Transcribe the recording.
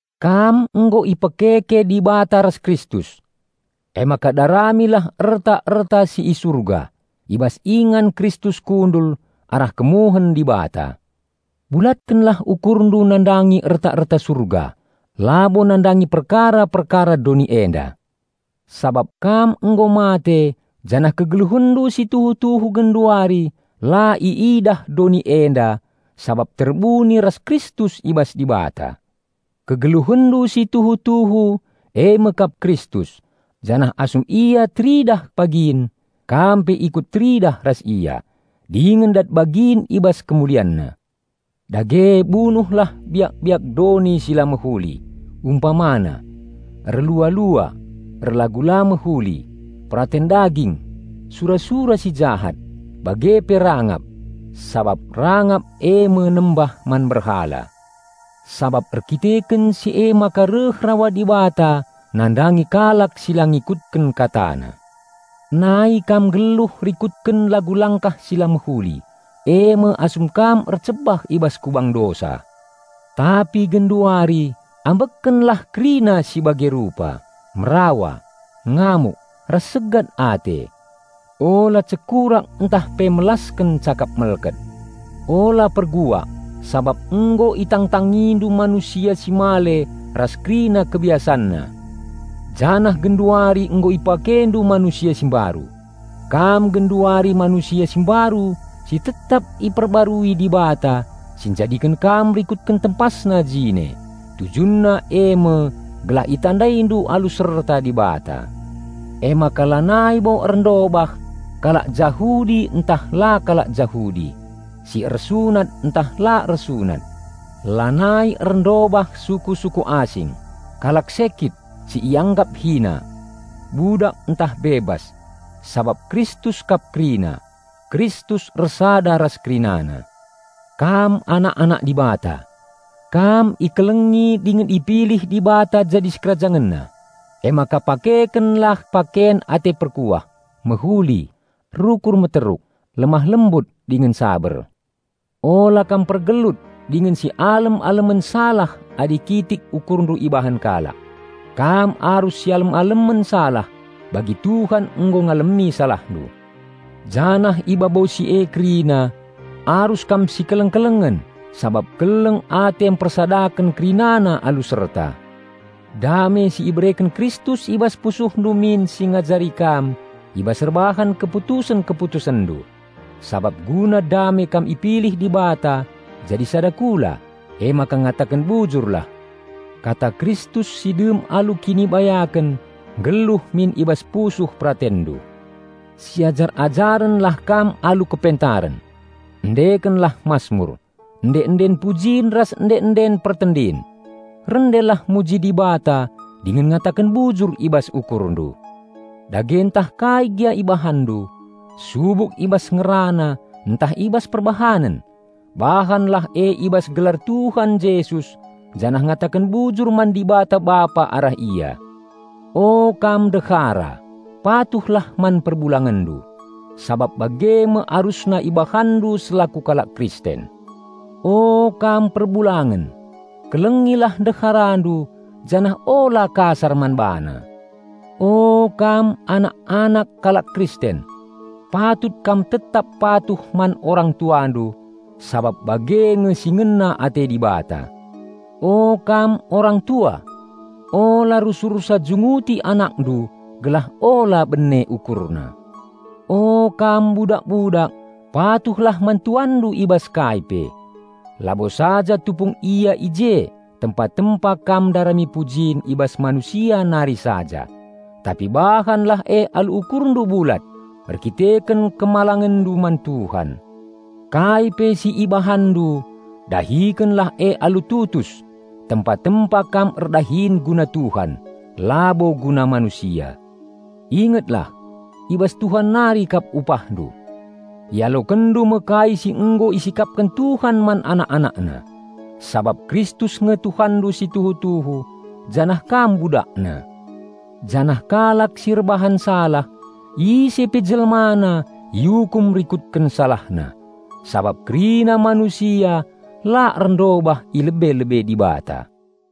Kam nggo ipekeke Dibata ras Kristus. Emaka darami lah erta-erta si i Surga, i bas ingan Kristus kundul arah kemuhen Dibata. Bulatkenlah ukurndu nandangi erta-erta Surga, labo nandangi perkara-perkara doni enda. Sabap kam nggo mate janah kegeluhenndu si tuhu-tuhu genduari la iidah doni enda sabap terbuni ras Kristus i bas Dibata. Kegeluhenndu si tuhu-tuhu e me kap Kristus, janah asum Ia teridah pagin, kam pe ikut teridah ras Ia, dingen dat bagin i bas KemulianNa. Dage bunuhlah biak-biak doni si la mehuli, umpamana: erlua-lua, erlagu la mehuli, peraten daging, sura-sura si jahat, bage pe rangap (sabap rangap e me nembah man berhala). Sabap erdandanken si emaka reh rawa Dibata nandangi kalak si la ngikutken KataNa. Nai kam nggeluh rikutken lagu langkah si la mehuli, e me asum kam ercebah i bas kubang dosa. Tapi genduari ambekkenlah kerina si bage rupa: merawa, ngamuk, ras segat ate. Ula cekurak ntah pe melasken cakap melket. Ula perbual, sabap nggo itangtangindu manusia si male ras kerina kebiasanna, janah genduari nggo ipakendu manusia si mbaru. Kam genduari manusia si mbaru si tetap ipebarui Dibata si njadiken kam rikutken TempasNa jine. Tujunna e me gelah itandaindu alu serta Dibata. Emaka lanai bo erndobah kalak Jahudi ntah la kalak Jahudi, si ersunat ntah la ersunat; lanai erndobah suku-suku asing, kalak Sekyt si ianggap hina, budak ntah bebas; sabap Kristus kap kerina. Kristus ersada ras kerinana. Kam anak-anak Dibata. Kam ikelengi dingen ipilih Dibata jadi SikerajangenNa. Emaka pakekenlah paken ate perkuah, mehuli, rukur meteruk, lemah-lembut dingen saber. Ula kam pergelut dingen si alem-alemen salah adi kitik ukurndu ibahan kalak. Kam arus sialem-alemen salah bagi Tuhan nggo ngalemi salahndu. Janah i babo si e kerina, arus kam sikeleng-kelengen sabap keleng ate mpersadaken kerinana alu serta. Dame si ibereken Kristus i bas pusuhndu min si ngajari kam i bas erbahan keputusen-keputusenndu. Sabap guna dame kam ipilih Dibata jadi sada kula. Emaka ngataken bujurlah. Kata Kristus si dem alu kinibayaken nggeluh min i bas pusuh peratenndu. Siajar-ajarenlah kam alu kepentaren. Endekenlah masmur, ende-enden pujin ras ende-enden pertendin. Rendelah muji Dibata dingen ngataken bujur i bas ukurndu. Dage ntah kai gia ibahanndu, subuk i bas ngerana ntah i bas perbahanen, bahanlah e i bas gelar Tuhan Jesus janah ngataken bujur man Dibata Bapa arah Ia. O, kam ndehara, patuhlah man perbulangenndu, sabap bage me arusna ibahanndu selaku kalak Kristen. O, kam perbulangen, kelengilah ndeharandu janah ula kasar man bana. O, kam anak-anak, kalak Kristen, patut kam tetap patuh man orang-tuandu sabap bage nge si ngena ate Dibata. O, kam orang-tua ula rusursa junguti anakndu gelah ula bene ukurna. O, kam budak-budak patuhlah man tuanndu i bas kai pe. Labo saja tupung ia i je tempa-tempa kam ndarami pujin i bas manusia nari saja; tapi bahanlah e alu ukurndu bulat, erkiteken kemalangenndu man Tuhan. Kai pe si ibahanndu, dahikenlah e alu tutus, tempa-tempa kam erdahin guna Tuhan, labo guna manusia. Ingetlah, i bas Tuhan nari kap upahndu. Ialokenndu me kai si nggo isikapken Tuhan man anak-AnakNa. Sabap Kristus nge Tuanndu si tuhu-tuhu, janah kam BudakNa. Janah kalak si erbahan salah, ise pe jelmana iukum rikutken salahna, sabap kerina manusia la erndobah i lebe-lebe Dibata.